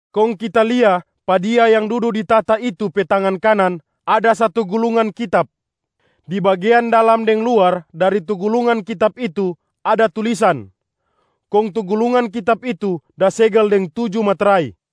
Kong kita lia pa Dia yang dudu di tahta itu pe tangan kanan ada satu gulungan kitab. Di bagean dalam deng luar dari tu gulungan kitab itu ada tulisan, kong tu gulungan kitab itu da segel deng tuju metrai.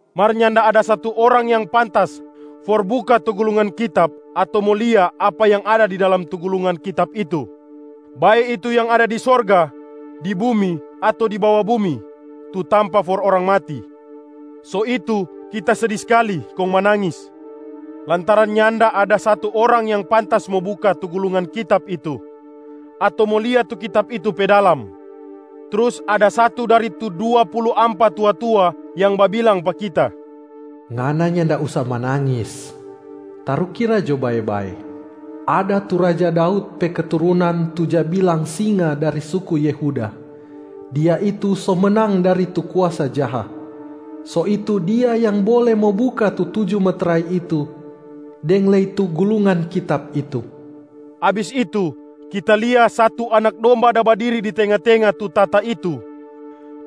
Mar nyanda ada satu orang yang pantas for buka tu gulungan kitab ato mo lia apa yang ada di dalam tu gulungan kitab itu, bae itu yang ada di sorga, di bumi ato di bawa bumi tu tampa for orang mati. So itu kita sedi skali kong manangis, lantaran nyanda ada satu orang yang pantas mo buka tu gulungan kitab itu ato mo lia tu kitab itu pe dalam. Trus ada satu dari tu dua pulu ampa tua-tua yang babilang pa kita, “Ngana nyanda usa manangis. Tarukira jo bae-bae, ada tu raja Daud pe keturunan tu ja bilang Singa dari suku Yehuda, Dia itu so menang dari tu kuasa jaha. So itu Dia yang bole mo buka tu tuju metrai itu deng lei tu gulungan kitab itu.” Abis itu, kita lia satu Anak Domba da badiri di tenga-tenga tu tahta itu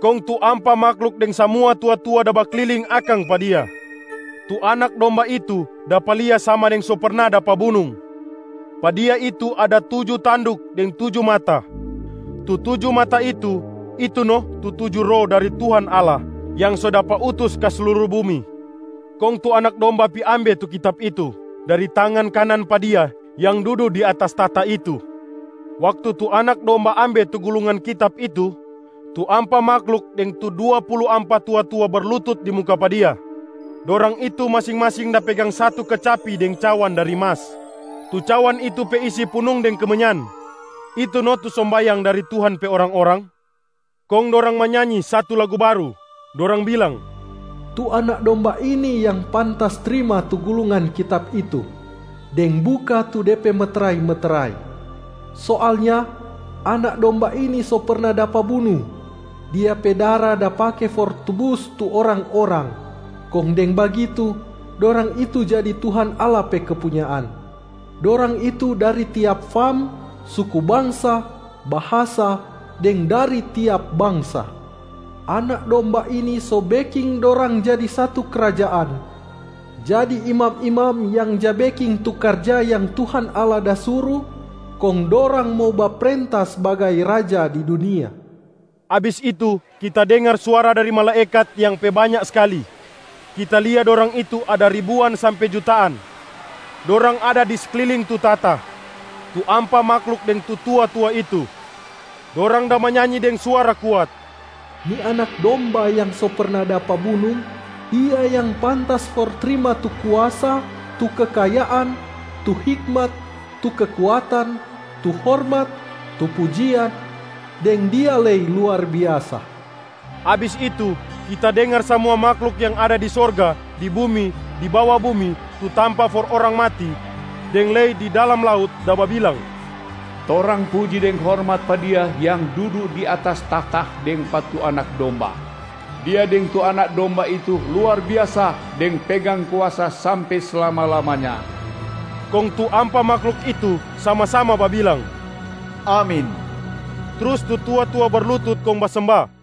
kong tu ampa mahluk deng samua tua-tua da bakliling akang pa Dia. Tu Anak Domba itu dapa lia sama deng so perna dapa bunung. Pa Dia itu ada tuju tanduk deng tuju mata. Tu tuju mata itu, itu no tu tuju Roh dari Tuhan Allah yang so dapa utus ka sluru bumi. Kong tu Anak Domba pi ambe tu kitab itu dari tangan kanan pa Dia yang dudu di atas tahta itu. Waktu tu Anak Domba ambe tu gulungan kitab itu, tu ampa mahluk deng tu dua pulu ampa tua-tua berlutut di muka pa Dia. Dorang itu masing-masing da pegang satu kecapi deng cawan dari mas. Tu cawan itu pe isi punung deng kemenyan, itu no tu sombayang dari Tuhan pe orang-orang. Kong dorang manyanyi satu lagu baru, dorang bilang, “Tu Anak Domba ini yang pantas trima tu gulungan kitab itu, deng buka tu de pe metrai-metrai. Soalnya Anak Domba ini so perna dapa bunung, Dia pe dara da pake for tubus tu orang-orang, kong deng bagitu dorang itu jadi Tuhan Allah pe kepunyaan. Dorang itu dari tiap fam, suku bangsa, bahasa deng dari tiap bangsa. Anak Domba ini so beking dorang jadi satu krajaan, jadi imam-imam yang ja beking tu karja yang Tuhan Allah da suru, kong dorang mo baprenta sbagai raja di dunia.” Abis itu kita dengar suara dari malaekat yang pe banya skali, kita lia dorang itu ada ribuan sampe jutaan. Dorang ada di sekliling tu tahta, tu ampa mahluk deng tu tua-tua itu. Dorang da manyanyi deng suara kuat, “Ni Anak Domba yang so perna dapa bunung, Dia yang pantas for trima tu kuasa, tu kekayaan, tu hikmat, tu kekuatan, tu hormat, tu pujian, deng Dia lei luar biasa.” Abis itu, kita dengar samua mahluk yang ada di sorga, di bumi, di bawa bumi tu tampa for orang mati, deng lei di dalam laut da babilang, “Torang puji deng hormat pa Dia yang dudu di atas tahta deng pa tu Anak Domba. Dia deng tu Anak Domba itu luar biasa deng pegang kuasa sampe slama-lamanya.” Kong tu ampa mahluk itu sama-sama babilang, “Amin!” Trus tu tua-tua berlutut kong basemba.